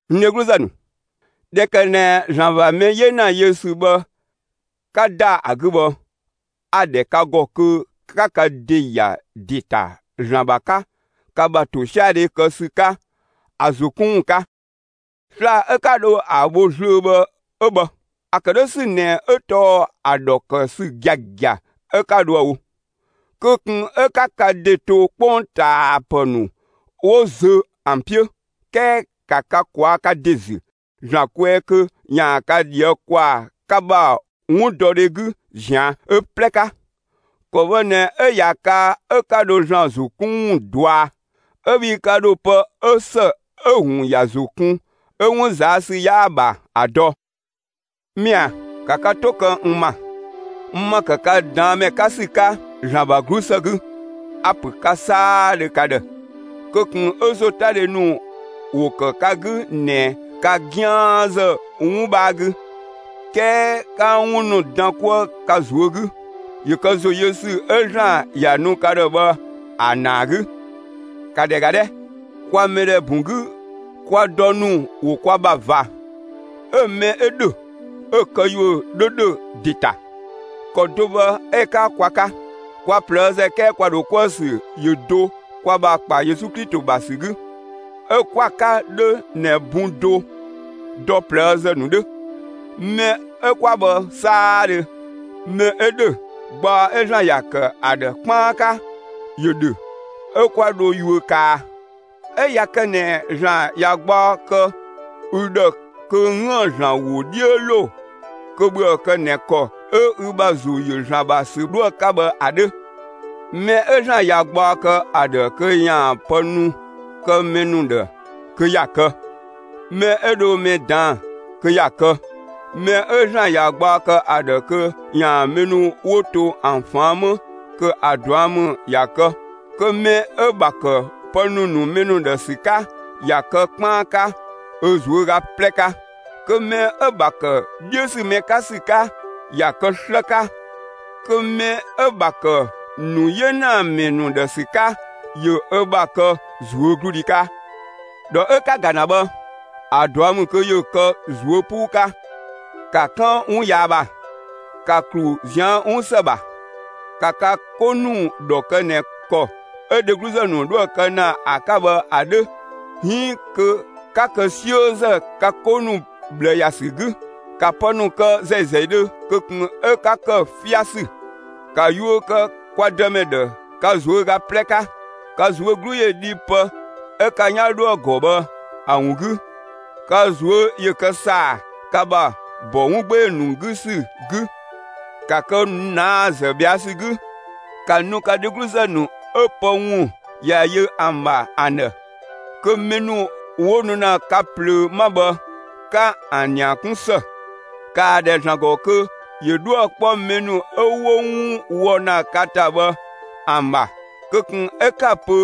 N dhegluzë ‑nu, ꞊dhɛ ‑kë ꞊nɛ ‑Zlan ‑bha mɛ 'yena yö ‑sü bhë 'ka ‑da ‑a 'gü bhë, a‑ ‑dhɛ ka ‑gɔ kö 'ka ka ‑de ‑ya ‑de ‑ta ‑Zlan ‑bha 'ka ka ‑bha ‑tosiadhe kë ‑sü 'ka ‑a ‑zo 'kun ‑wun 'ka. Sla‑ 'ö 'ka dho ‑a bho zlöö bhë 'ö bhë. ‑A ‑kë 'dhö ‑sü ꞊nɛ 'ö tɔɔ ‑a ‑dhɔ kë ‑sü giagia 'ö 'ka dhoë‑ wo. Kö ꞊kun 'ö 'ka ka ‑de to 'kpongtaapë ‑nu 'wo zö ‑an 'piö; 'kɛɛ ‑ka ka ꞊kwaa'‑ ka ‑de ‑zü ‑Zlan kwɛɛ kö ‑yaan ka ꞊dhië' ‑kwaa ka ‑bha 'wundɔdhe 'gü ꞊zian' ö 'plɛ 'ka. ‑Kɔ bhë ꞊nɛ 'ö ꞊ya kaa 'ö 'ka dho ‑Zlan ‑zo 'kun ‑wun dɔa, 'ö bhii ka ‑dho pë 'ö ‑së 'ö‑ ‑wun ‑ya ‑zo kun 'ö 'wun ꞊zaa' ‑sü 'yaa‑ ‑bha ‑a dɔ. Mɛa‑, ‑ka ka 'to kë n ‑ma, n ‑ma ‑kë ka ꞊daan' ‑mɛ 'ka ‑sü 'ka ‑Zlan ‑bha 'glusë 'gü; a‑ ‑pö ka 'saadhö ka ‑dhë: Kö ꞊kun 'ö ‑zotadhe ‑nu ‑wo ‑kë ka 'gü ꞊nɛ ka 'gianzë 'wun 'bhaa 'gü; 'kɛɛ 'ka 'wun ‑nu dan 'kuë ka ꞊zuö' 'gü, ‑yö kë ‑zo yö ‑sü 'ö ‑Zlan ‑ya nu ka ‑dhë bhë ‑a ‑naa 'gü. ‑Ka ‑dhɛ ‑ga 'dhɛ! Kwa mɛdhɛ bun 'gü, kwa dɔ ‑nu ‑wo kwa ‑bha ꞊va; 'ö‑ mɛ 'ö ‑dhö, 'ö‑ këyuö 'dhö ‑dhö ‑de ‑ta. ‑Kɔ do bhë 'ö‑ 'ka kwa 'ka; kwa ꞊plëëzë; 'kɛɛ kwa ‑dho 'kuë‑ ‑sü ‑yö do kwa ‑bha ‑kpa Yesu Klito ‑bha ‑sü 'gü, 'ö 'kwa‑ 'ka 'dhö ꞊nɛ bun do dɔ ꞊plëëzë ‑nu 'dhö. Mɛ 'ö 'kwa bhë 'saadhö, mɛ 'ö ‑dhö, gbaɔ 'ö ‑Zlan ‑ya ‑kë ‑a ‑dhë 'kpaan 'ka, ‑yö ‑dhö, 'ö 'kwa dho yuö kaa. 'Ö ꞊ya kë ꞊nɛ ‑Zlan ‑ya gbaɔ kë ü ‑dhë kö 'üën‑ ‑Zlan ‑wo 'dhiö ‑lo, kö ‑bhöë kë ꞊nɛ ‑kɔ 'ö ü ‑bha ‑zo ‑yö ‑Zlan ‑bha ‑sü 'dhoë‑ 'ka bhë ‑a 'dhö. Mɛ 'ö ‑Zlan ꞊ya gbaɔ kë ‑a ‑dhë kö ‑yaan pë ‑nu kë mɛ ‑nu ‑dhë, kö ‑ya kë. Mɛ 'ö dho mɛ ꞊daan'‑, kö ‑ya kë. Mɛ 'ö ‑Zlan ꞊ya gbaɔ kë ‑a ‑dhë kö ‑yaan mɛ ‑nu 'wo to ‑an ꞊faan' 'më, kö ‑a ꞊dua' ‑mü ‑ya kë. Kö mɛ 'ö‑ ‑bha ‑kë pë ‑nu ‑nu mɛ ‑nu ‑dhë ‑sü 'ka, ‑ya kë 'kpaan 'ka ö ꞊zuöga 'plɛ 'ka; kö mɛ 'ö‑ ‑bha ‑kë 'dhiö ‑sü mɛ 'ka ‑sü 'ka ‑ya ‑kë 'slë 'ka. Kö mɛ 'ö‑ ‑bha ‑kë ‑nu 'yenamɛ ‑nu ‑dhë ‑sü 'ka, ‑yö ö ‑bha kë ꞊zuögludhi 'ka. ‑Dhɔ 'ö 'ka‑ ‑ga ‑na bhë, ‑a ꞊dua' ‑mü kö ‑yö kë ꞊zuö' 'puu 'ka. ‑Ka 'kan 'wun yaa ‑bha, 'ka ‑klu ꞊zian' 'wun ‑së ‑bha. ‑Ka ka 'ko ‑nu ‑dhɔ kë ꞊nɛ ‑kɔ 'ö dhegluzë ‑nu 'dhoë‑ kë ‑na ‑a 'ka bhë ‑a 'dhö, 'iin kö 'ka kë 'siözë ka 'ko ‑nu ꞊bhlë ‑ya ‑sü 'gü. ‑Ka pë ‑nu kë ‑zɛi ‑zɛidhö; kö ꞊kun 'ö 'ka ‑kë 'fiasü. ‑Ka yuö kë kwa Dëmɛ ‑dhë ka ꞊zuöga 'plɛ 'ka! Ka ꞊zuö' 'glu ‑yö dhi pë 'ö ka 'yan 'dhoë‑ ‑gɔ bhë ‑a ‑wun 'gü. Ka ꞊zuö' ‑yö kë ‑saa, ka ‑bha ‑bɔ 'wun 'gbee‑ ‑nu 'gü ‑sü 'gü. ‑Ka kë ꞊naazë ꞊bhɛa' ‑sü 'gü! ‑Ka nu ka dhegluzë ‑nu 'ö pë ‑wun ‑ya yö ‑an ‑bha ‑an ‑dhë, kö mɛ ‑nu 'wo nu ‑na ka plöö 'ma bhë, 'ka ‑an ‑nia 'kun ‑së! ‑Kaa ‑dhɛ ‑Zlan ‑gɔ kö ‑yö 'dhuë‑ 'kpɔ mɛ ‑nu 'ö 'wo 'wun wɔ ‑na ka ‑ta bhë ‑an ‑bha; kö ꞊kun 'ö 'ka‑ pö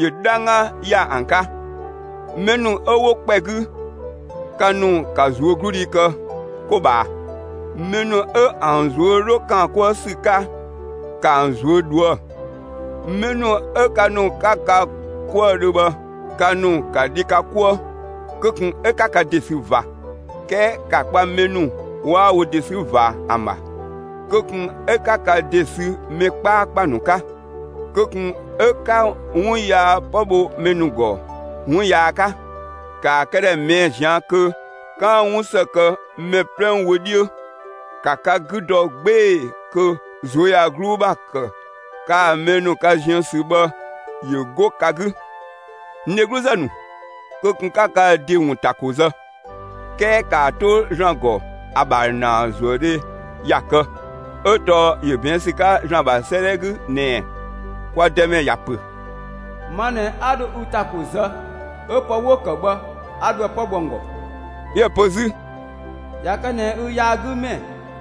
‑yö 'dhangga ‑ya ‑an 'ka. Mɛ ‑nu 'ö 'wo ‑kpɛ 'gü, ka ‑nu ka ꞊zuögludhi kë 'ko ꞊bhaa! Mɛ ‑nu 'ö ‑an ꞊zuö' 'dhö ‑kaan 'kuë ‑sü 'ka, ‑ka ‑an ꞊zuö' ꞊dhuë'. Mɛ ‑nu 'ö ka ‑nu 'ka ka 'kuëdhö bhë, ka ‑nu ‑ka dhi ka 'kuëë; kö ꞊kun 'ö 'ka ka ‑de sü ꞊va, 'kɛɛ ‑ka kpa mɛ ‑nu 'waa wo ‑de 'sü ꞊va ‑an ‑bha! Kö ꞊kun 'ö 'ka ka ‑de sü mɛ 'kpaakpa ‑nu 'ka! Kö ꞊kun 'ö 'ka 'wun yaa 'pë bho mɛ ‑gɔ 'wun yaa 'ka; ‑kaa këdhɛ ꞊mɛɛ'‑ ꞊zian' kö 'kaan‑ 'wun ‑së kë mɛ 'plɛ wö 'dhiö. ‑Ka ka 'gü dɔ 'gbee‑ kö ꞊zuöyagluu ‑bha ‑kë kaa‑ mɛ ‑nu ka ziën ‑sü bhë, ‑yö 'go ka 'gü. N dhegluzë ‑nu, kö ꞊kun 'ka ka ‑de ‑wun ‑ta ‑ko zë; 'kɛɛ ‑kaa 'to ‑Zlan ‑gɔ ‑a ‑bha ‑naazuëdhe ‑ya kë, 'ö tɔɔ ‑yö ꞊bɛɛn' ‑sü 'ka ‑Zlan ‑bha 'sëëdhɛ 'gü ꞊nɛ: Kwa Dëmɛ ‑ya ‑pö: Ma ꞊nɛ 'a dho ü ‑ta ‑ko zë, 'ö pë 'wo‑ ‑kë bhë, 'a dho ‑a 'pë bho ‑an ‑gɔ. 'Yö‑ pö 'zü: ꞊Ya kë ꞊nɛ ü yaagümɛ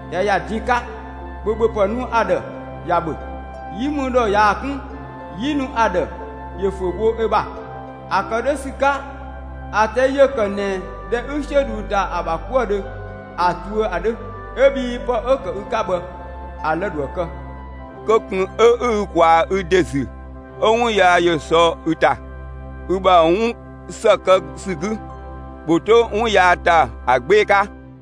꞊ya ‑ya din 'ka, ‑bhö ‑bhöpë nu ‑a ‑dhë ‑ya ‑bhö; 'yi mü ‑dhɔ ꞊yaa‑ 'kun, 'yi nu ‑a ‑dhë ‑yö ‑fö bho ö ‑bha. ‑A ‑kë 'dhö ‑sü 'ka, ‑a ꞊tɛi' ‑yö ‑kë ꞊nɛ ꞊dhɛ ü 'siö ꞊dhuu ‑da ‑a ‑bha 'kuëdhö ‑a tuö ‑a 'dhö. ('Ö bhii pë 'ö‑ ‑kë ü 'ka bhë, ‑a lë‑ ‑dhoë kë.) Kö ꞊kun 'ö 'ü ü ꞊kwaa‑ ü ‑de ‑zü 'ö 'wun yaa ‑yö sɔ ü ‑ta. Ü ‑bha 'wun ‑së kë ‑sü 'gü, ‑bhö 'to 'wun yaa ‑ta ‑a 'gbee‑ 'ka.